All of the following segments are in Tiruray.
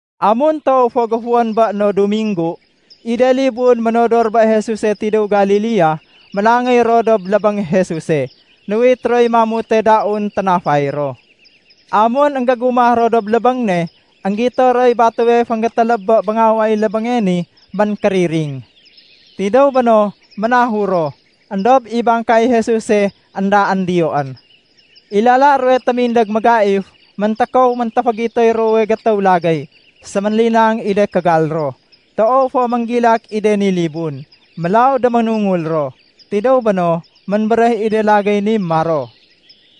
Amun toow fo géfuwén bé no Duminggu, i de libun ménodor bé Jesuse tidéw Galilea, ménangéy ro dob lébéng Jesuse. Nuwit roy mamute daun ténafay ro. Amun énggégumah ro dob lébéng ne, énggito roy batéwe fénggétéléb bé béngaway lébénge ni ménkériring. Tidéw béno, ménahur ro, éndob i bangkay Jesuse éndaén diyoén. I lala ruwe témindég mégaif, méntékow méntéfégitoy ruwowe gétéw lagéy, sémélinang i de kégal ro. Toow fo ménggilak i de ni libun, mélaw déménungul ro. Tidéw béno, ménbéréh i de lagéy ni maro,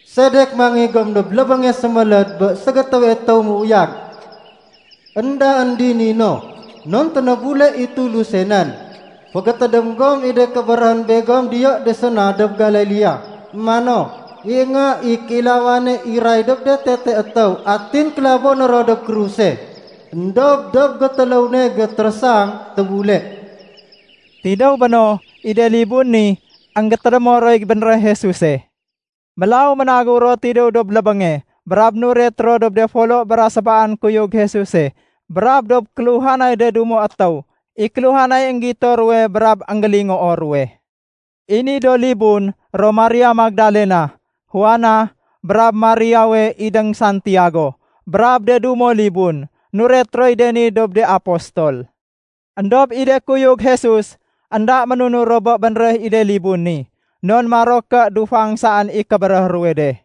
“Sedek mangéy gom dob lébénge séméléd bé ségétéwe étéw méuyag? Endaén dini no, non ténébule i Tuluse nén. Fégétédém gom i de kébéréhén begom diyo de séna dob Galilea mano, ‘I Nga i Kéilawane iray dob de tete étéw atin kélaboné ro dob kruse. Endob dob gétéléw ne gétérésang, tébule.’” Tidéw béno, i de libun ni, énggétédémo roy bénréh Jesuse. Mélaw ménagéw ro tidéw dob lébénge brab nuret ro dob de folo bra sébaan kuyug Jesuse brab dob kéluhanay de dumo étéw i kéluhanay énggito ruwe brab énggélingoo ruwe. (I ni do libun ro Maria Magdalena, Juana, brab Mariawe idéng Santiago, brab de dumo libun, nuret roy de ni dob de apostol.) Endob i de kuyug Jesus, énda ménunur ro bé bénréh i de libun ni, non maro ké dufang saén i kébéréh ruwe de.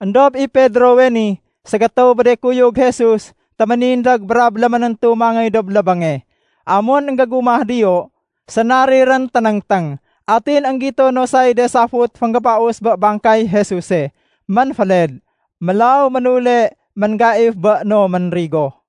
Endob i Pedrowe ni ségétéw bé de kuyug Jesus téménindég brab léménéntu mangéy dob lébénge. Amun énggégumah diyo, sénarirén ténéngténg, atin énggito no say de safut fénggébaus bé bangkay Jesuse, ménféled. Mélaw ménule ménggaif bé no ménrigo.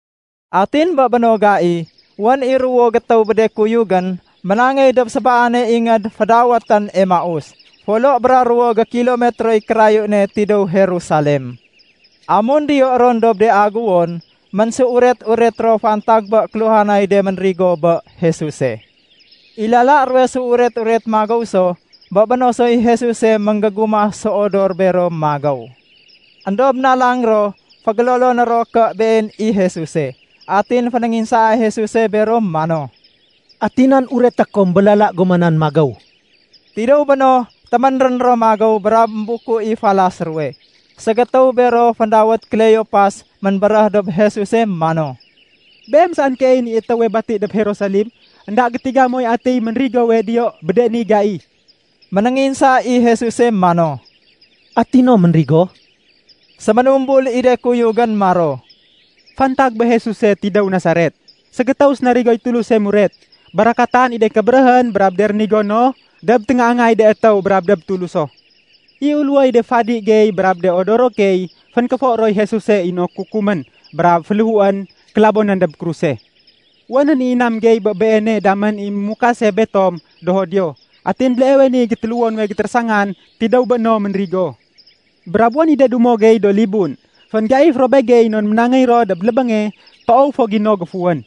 Atin bé béno gai, wén i ruwo gétéw bé de kuyugén ménangéy dob sébaane ingéd fédawétén Emaus, folo bra ruwo gékilometroy kérayu ne tidéw Jerusalem. Amun diyo ron dob de aguwon, ménséuret-uret ro fantag bé kéluhanay de ménrigo bé Jesuse. I lala ruwe séuret-uret magéw so, bé béno soy Jesuse ménggégumah séodor béro magéw. Endob nalang ro fégéloloné ro ké Been i Jesuse. Atin fénénginsaa Jesuse bero mano, “Ati nan ureté kom bé lala goma nan magéw?” Tidéw béno, téménrén ro magéw brab ménbuku i falas ruwe. Ségétéw bero féndawét Kleopas ménbéréh dob Jesuse mano, “Beem saén keeyén i étéwe bati dob Jerusalem, énda gétiga moy atiy ménrigowe diyo bé de ni gai.” Ménénginsa i Jesus mano, “Ati no ménrigo?” Séménumbul i de kuyugén maro, “Fantag bé Jesuse tidéw Nasaret, ségétéw sénarigoy Tuluse muret. Barakatan i de kébéréhén brab de rénigo no dob téngaangay de étéw brab dob Tuluso. I uléwoy de fadi gey brab de odoro key fénkéfo roy Jesuse inok kukumén brab féléhuén kélabonén dob kruse. Wénén i inam gey bé Beene damén i mémukase betom do Judio. Atin béleewe niy gétéléwo nuwe gétérésangan tidéw bé no ménrigo. Brab wén i de dumo gey do libun, fénggaif ro begey non ménangéy ro dob lébénge toow fo gino géfuwén.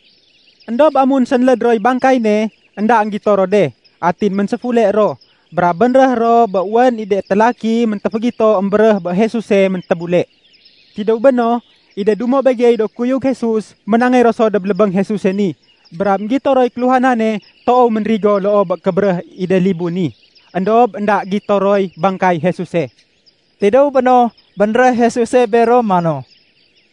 Endob amun sénléd roy bangkay ne, énda énggito ro de. Atin ménséfule ro, brab bénréh ro bé wén i de télaki méntéfégito émbéréh bé Jesuse méntébule. Tidéw béno, i de dumo begey do kuyug Jesus ménangéy ro so dob lébéng Jesuse ni, brab énggito roy kéluhanane toow ménrigo loo bé kébéréh i de libun ni, éndob énda gito roy bangkay Jesuse.” Tidéw béno, bénréh Jesuse bero mano,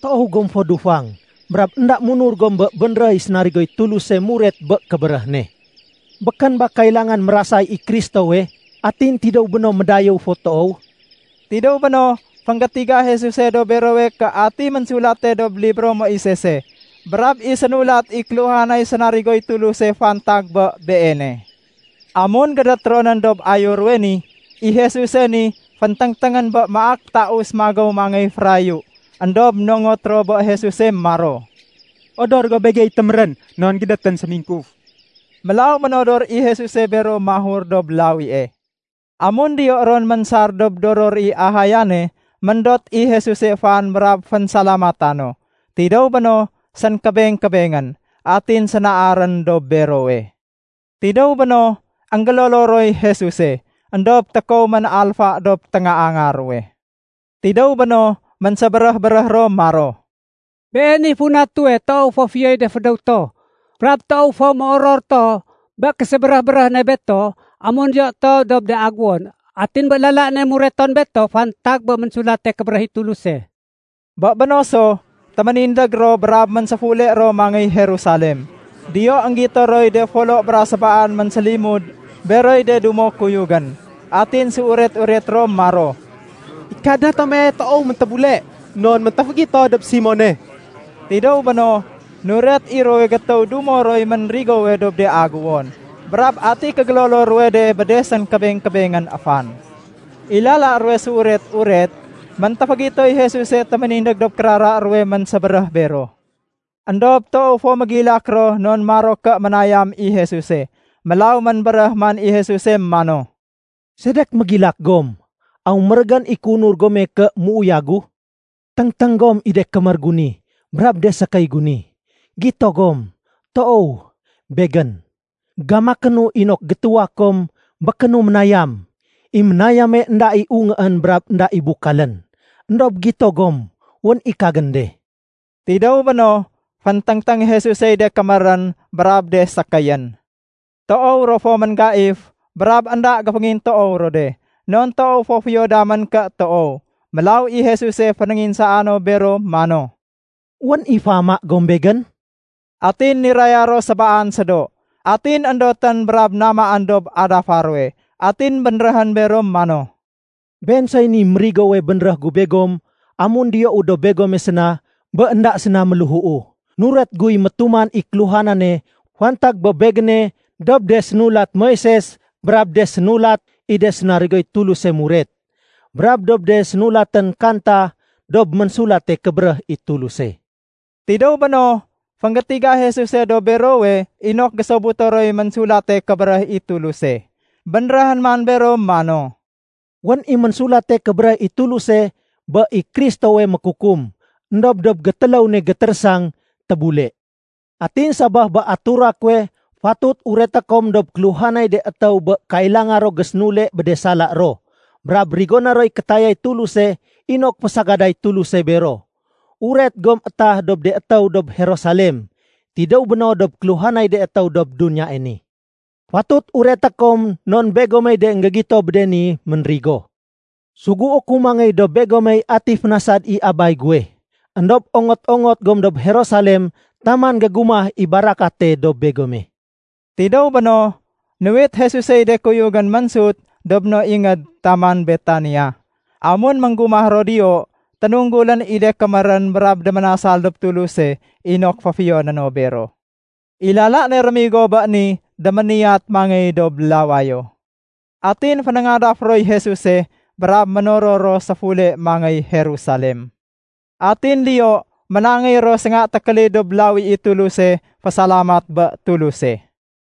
“Toow gom fo dufang, brab énda munur gom bé bénréh i sénarigoy Tuluse muret bé kébéréh ne. Békén ba kailangan mérasay i Kristowe atin tidéw béno médayéw fo toow?” Tidéw béno, fénggétiga Jesuse dob berowe ké atiy ménsulate dob libro Moisese brab i sénulat i kéluhanay sénarigoy Tuluse fantag bé Beene. Amun gédét ro nén dob ayo ruwe ni, i Jesuse ni fénténgténgén bé maak taus magéw mangéy férayu. Endob nongot ro bé Jesuse maro, “Odor go begey témérén non gédétén sémingkuf.” Mélaw ménodor i Jesuse bero mahur dob lawie. Amun diyo ron ménsar dob doror i ahayane, méndot i Jesuse fan brab fénsalamata no. Tidéw béno, sénkébeng-kébengén, atin sénaarén dob berowe. Tidéw béno, énggélolo roy Jesuse, éndob tékow ménalfa dob téngaanga ruwe. Tidéw béno, ménsébéréh-béréh ro maro, “Been i funa tuwe toow fo fiyoy de fédéw to brab toow fo méoror to bé késébéréh-béréh ne beto amun diyo to dob de aguwon atin bé lala ne mureton beto fantag bé Ménsulate Kébéréh i Tuluse.” Bé béno so, téménindég ro brab ménséfule ro mangéy Jerusalem. Diyo énggito roy de folo bra sébaan ménsélimud beroy de dumo kuyugén. Atin séuret-uret ro maro, “I Kadna tome toow méntébule, non méntéfégito dob Simone.” Tidéw béno, nuret i ruwowe gétéw dumo roy ménrigowe dob de aguwon, brab ati kégélolo ruwe de bé de sékébeng-kébengén fan. I lala ruwe séuret-uret, méntéfégitoy Jesuse téménindég dob kérara ruwe ménsébéréh bero. Endob toow fo mégilak ro non maro ké ménayam i Jesuse. Mélaw ménbéréh man i Jesuse mano, “Sedek mégilak gom? Aw mérégén i kéunur gome ké méuyagu? Téngténg gom i de kémér gu ni brab de sékéy gu ni. Gito gom? Toow, Begén. Gamakénu inok gétuwa kom békénu ménayam. I ménayame énda i ungéén brab énda i bukalén. Endob gito gom, wén i kagén de.” Tidéw béno, fénténgténg Jesusey de kémérén brab de sékéyén. Toow ro fo ménggaif brab énda géféngintoow ro de, non toow fo fiyo damén ké toow. Mélaw i Jesuse fénénginsaa no bero mano, “Wén i féama gom Begén?” Atin niraya ro sébaan sédo, atin éndotén brab namaén dob adafa ruwe. Atin bénréhén bero mano, “Been soy ni mérigowe bénréh gu begom amun diyou dob begome séna bé énda séna méléhuu. Nuret guy métuman i kéluhanane fantag bé Begéne dob de sénulat Moises brab de sénulat i de sénarigoy Tuluse muret, brab dob de sénulatén kanta dob Ménsulate Kébéréh i Tuluse.” Tidéw béno, fénggétiga Jesuse dob berowe inok gésobuto roy Ménsulate Kébéréh i Tulus. Bénréhén man bero mano, “Wén i Ménsulate Kébéréh i Tuluse bé i Kristowe mékukum, éndob dob gétéléw ne gétérésang tébule. Atin sabaf bé atura kuwe fatut ureté kom dob kéluhanay de étéw bé kailanga ro gésénule bé de sala ro brab rigoné roy kétayay Tuluse inok fésagaday Tuluse bero. Uret gom étah dob de étéw dob Jerusalem, tidéw béno dob kéluhanay de étéw dob duniyae ni. Fatut ureté kom non begomey de énggégito bé de ni ménrigo. Sugué ku mangéy dob begomey ati fénasad i Abay guwe. Endob ongot-ongot gom dob Jerusalem taman gégumah i barakate dob begome.” Tidéw béno, nuwit Jesusey de kuyugén ménsut dob no ingéd taman Betania. Amun ménggumah ro diyo, ténunggulén i de kémérén brab déménasal dob Tuluse inok féfiyoné no bero. I lala ne rémigo bé ni, déméniyat mangéy dob lawayo. Atin fénéngadaf roy Jesuse, brab ménoror ro séfule mangéy Jerusalem. Atin diyo ménangéy ro sénga tékélid dob lawi i Tuluse fésalamat bé Tuluse.